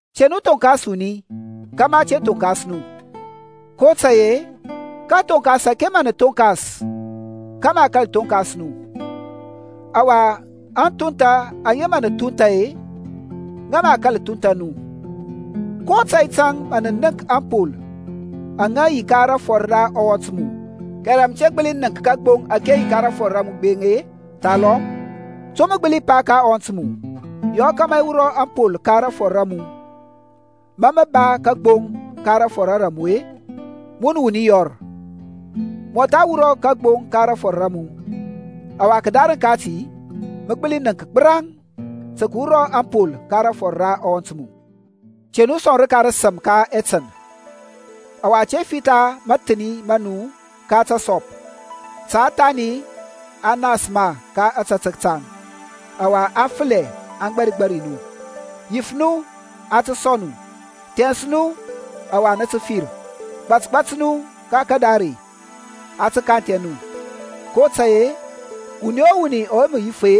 Te nu thonkas wuni, kȧmȧ a te thonkas nu. kotȧy-e kathoŋkas ȧke mǝ nǝ thoŋkas-e kǝ mǝ a thonkas nu; ɔwa aŋthuntha aŋa mǝ nǝ thunth-e, ŋǝ mǝ a kȧl thuntha nu. Ko tȧy tȧŋ mǝ nənk ȧŋpol aŋa yi ka rafɔr ra ɔwɔnt mu kɛrɛ mǝ te nənk kagboŋ ȧke yi ka rafɔr ra mu gbeŋ-e? Thalɔm to mǝ gbǝli pa ka ɔwɔnt mu, Yɔ kȧmȧ i wurɔ ȧŋpol ka rafɔr ra mu, ma mǝ ba kagboŋ ka rafɔr ra mu-e? Mun wuni yɔr, mɔtha wurɔ kagboŋ ka rafɔr ra mu, ɔwa kǝdarǝŋ kati mǝ tǝ gbǝli nənk gbǝraŋ tǝ kǝwura ȧŋpol ka rafɔr ra ɔwɔnt mu. Te nu sɔŋ rǝka rǝsǝm ka ɛtǝn, ɔwa te fitha mȧthǝni ma nu ka tǝsɔp, ta thani aŋ nas ma ka ȧtȧtək taŋ, ɔwa aŋ fǝlɛ aŋ gbarigbari nu. Yif nu, a tǝ sɔŋ nu. Thɛns nu, ɔwa nǝ tǝ fir. Gbȧtgbȧt nu ka kȧdare, a tǝ kanthɛ nu; kotȧy-e wuni o wuni ɔwe mǝ yif-e,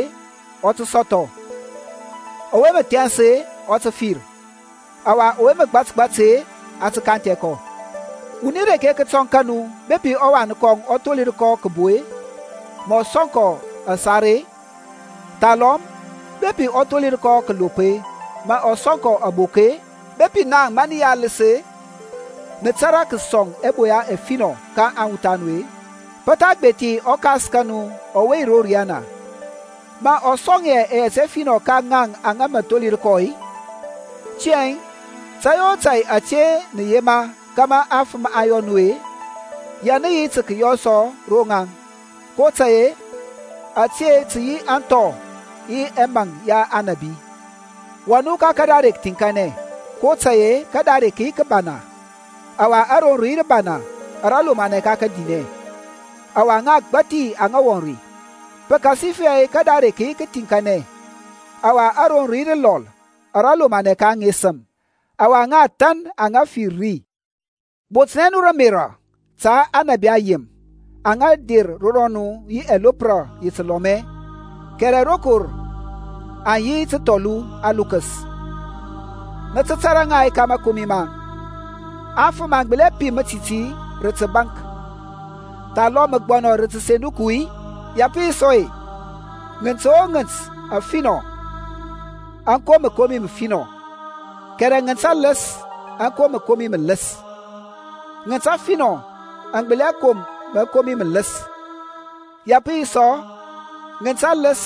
ɔ tǝ sɔthɔ, ɔwe mǝ thɛns-e, ɔ tǝ fir, ɔwa ɔwe mǝ gbatgbat-e, a tǝ kanthɛ kɔ. Wuni reke kǝtɔŋ ka nu-e, bepi ɔwan kɔŋ ɔ tholir kɔ kǝbo-e, mǝ ɔ sɔŋ kɔ asar-e? Thalɔm bepi ɔ tholir kɔ kǝlop-e, mǝ ɔ sɔŋ kɔ abok-e? Bepi naŋ ma nǝ yi alǝs-e, nǝ tȧrȧ kǝsɔŋ ɛboya ɛfinɔ ka aŋwuth a nu-e, pǝ tha gbethi ɔKas ka nu ɔwe yi ro riyana mǝ ɔ sɔŋ hɛ ɛyɛt ɛfinɔ ka ŋaŋ aŋa mǝ tholir kɔ-i? Tiyȧŋ tȧy o tȧy ȧte nǝ yema kȧmȧ afǝm aŋ yɔ nu-e, ya nǝ yi tǝ kǝyɔ sɔ ro ŋaŋ; kotȧy-e ȧte tǝ yi aŋthɔ yi ɛmaŋ ya aŋnabi. Wɔŋ nu ka kadare kǝthiŋkanɛ, kotȧy-e kadare kǝ yi kǝbana ɔwa aroŋ rǝ yi rǝbana ara lomanɛ ka kadinɛ, ɔwa ŋa agbȧthi aŋa wɔŋ ri. Pǝkasifɛ kadare kǝ thiŋkanɛ ɔwa aroŋ rǝ lɔl ara lomanɛ ka aŋesǝm, ɔwa ŋa athȧn aŋa fir ri. Botnɛ nu rǝ ȧmerȧ ta aŋnabi ayem aŋa mǝ der ro nu rǝ ɛlopra ya tǝlɔmɛ, kɛrɛ rokor aŋ yi tǝthɔlu alukǝs. Nǝ tǝ tȧrȧ ŋa ka mȧkomi maŋ. Afǝm aŋ gbǝli pim mǝtiti rǝ tǝbȧnk-i, thalɔm mǝgbɔnɔ rǝ tǝsenduku-i? Ya pǝ yi sɔ-e, ŋǝnt o ŋǝnt afinɔ aŋ kom mǝkomi mǝfinɔ, kɛrɛ ŋǝnt alǝs aŋ kom mǝkomi mǝlǝs. Ŋǝnt afinɔ aŋ gbǝli hɛ kom mǝkomi mǝlǝs, ya pǝ yi sɔ, ŋǝnt alǝs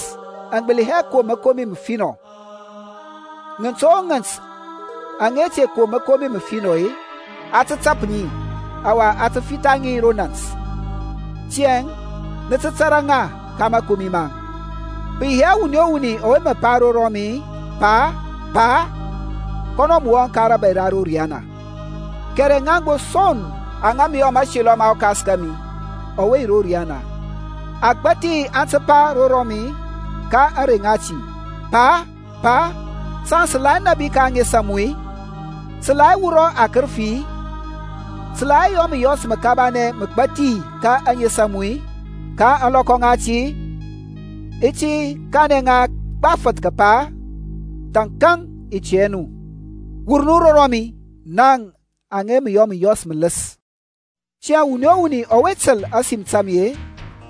aŋ gbǝli hɛ kom mǝkomi mǝfinɔ. Ŋǝnt o ŋǝnt aŋa te kom mǝkomi mǝfinɔ-e, a tǝ tap ŋi, ɔwa a tǝ fitha ŋi ro nȧnt. Tiyȧŋ nǝ tǝ tȧrȧ ŋa ka mȧkomi maŋ. Pǝ yi hɛ wuni o wuni ɔwe mǝ pa ro mi, Pa, Pa, kɔnɔ mǝ wɔŋ ka rȧbȧy ra ro riyana, kɛrɛ ŋaŋ gbo son aŋa mǝ yɔ mȧselɔ ma ɔKas kȧmi ɔwe yi ro riyana. Agbȧthi aŋ tǝ pa ro rɔmi ka ȧŋrey ŋati, Pa, Pa, saŋ-e, sǝ la hɛ nȧbi ka ȧŋes a mu-i? Sǝ la hɛ wurɔ akǝrǝfi-i, sǝ la hɛ yɔ mǝyɔs mǝkabanɛ mǝgbathi ka ȧŋes a mu-i? Ka ȧŋlɔkɔ ŋati i ti kanɛ ŋa gbafǝth kǝpa, Thȧnkȧŋ i tɛ hɛ nu. Wur nu ro rɔmi, naŋ aŋa yɔ mǝyɔs mǝlǝs. Tiyȧŋ wuni o wuni ɔwe tǝl ȧsim ta mi-e,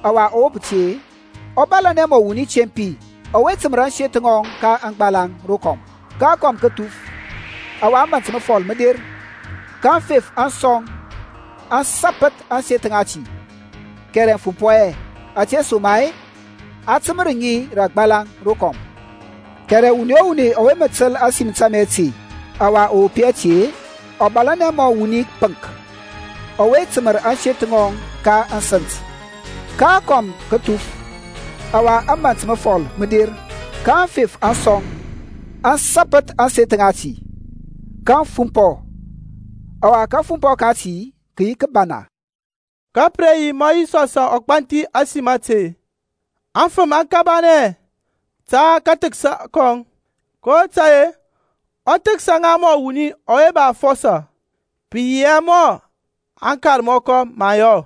ɔwa ɔ wop ti-e, ɔ bȧlȧnɛ mɔ wuni tempi ɔwe tǝmǝr ȧŋseth ŋɔŋ ka aŋgbalaŋ rokɔm. Ka akɔm kǝ thuf, ɔwa ȧmȧnt mǝfɔl mǝ der, ka aŋfef aŋ sɔŋ aŋ sapǝth ȧŋseth ŋati; kɛrɛ aŋ fumpɔ hɛ, ȧtesoma-e a tǝmǝr ŋi ka aŋgbalaŋ rokɔm. Kɛrɛ wuni o wuni ɔwe mǝ tǝl ȧsim ta mi ȧte, ɔwa ɔ wop hɛ ti-e, ɔ bȧlȧnɛ mɔ wuni pǝŋk ɔwe tǝmǝr ȧŋseth ŋɔŋ ka kȧsǝnt. Ka akɔm kǝ thuf, ɔwa ȧmȧnt mǝfɔl mǝ der, ka aŋfef aŋ sɔŋ, aŋ sȧpǝth ȧŋseth ŋati. Kaŋ fumpɔ, ɔwa kȧfumpɔ kati kǝ yi kǝbana. Ka pǝ re yi ma Yisɔs ɔ gbanthi ȧsim ȧte, aŋfǝm aŋ kabanɛ ta kathǝksa kɔŋ, kotȧy-e ɔ thǝksa ŋa mɔ wuni ɔwe ba afɔsɔ, pǝ yi hɛ mɔ aŋkarmɔkɔ aŋ yɔ.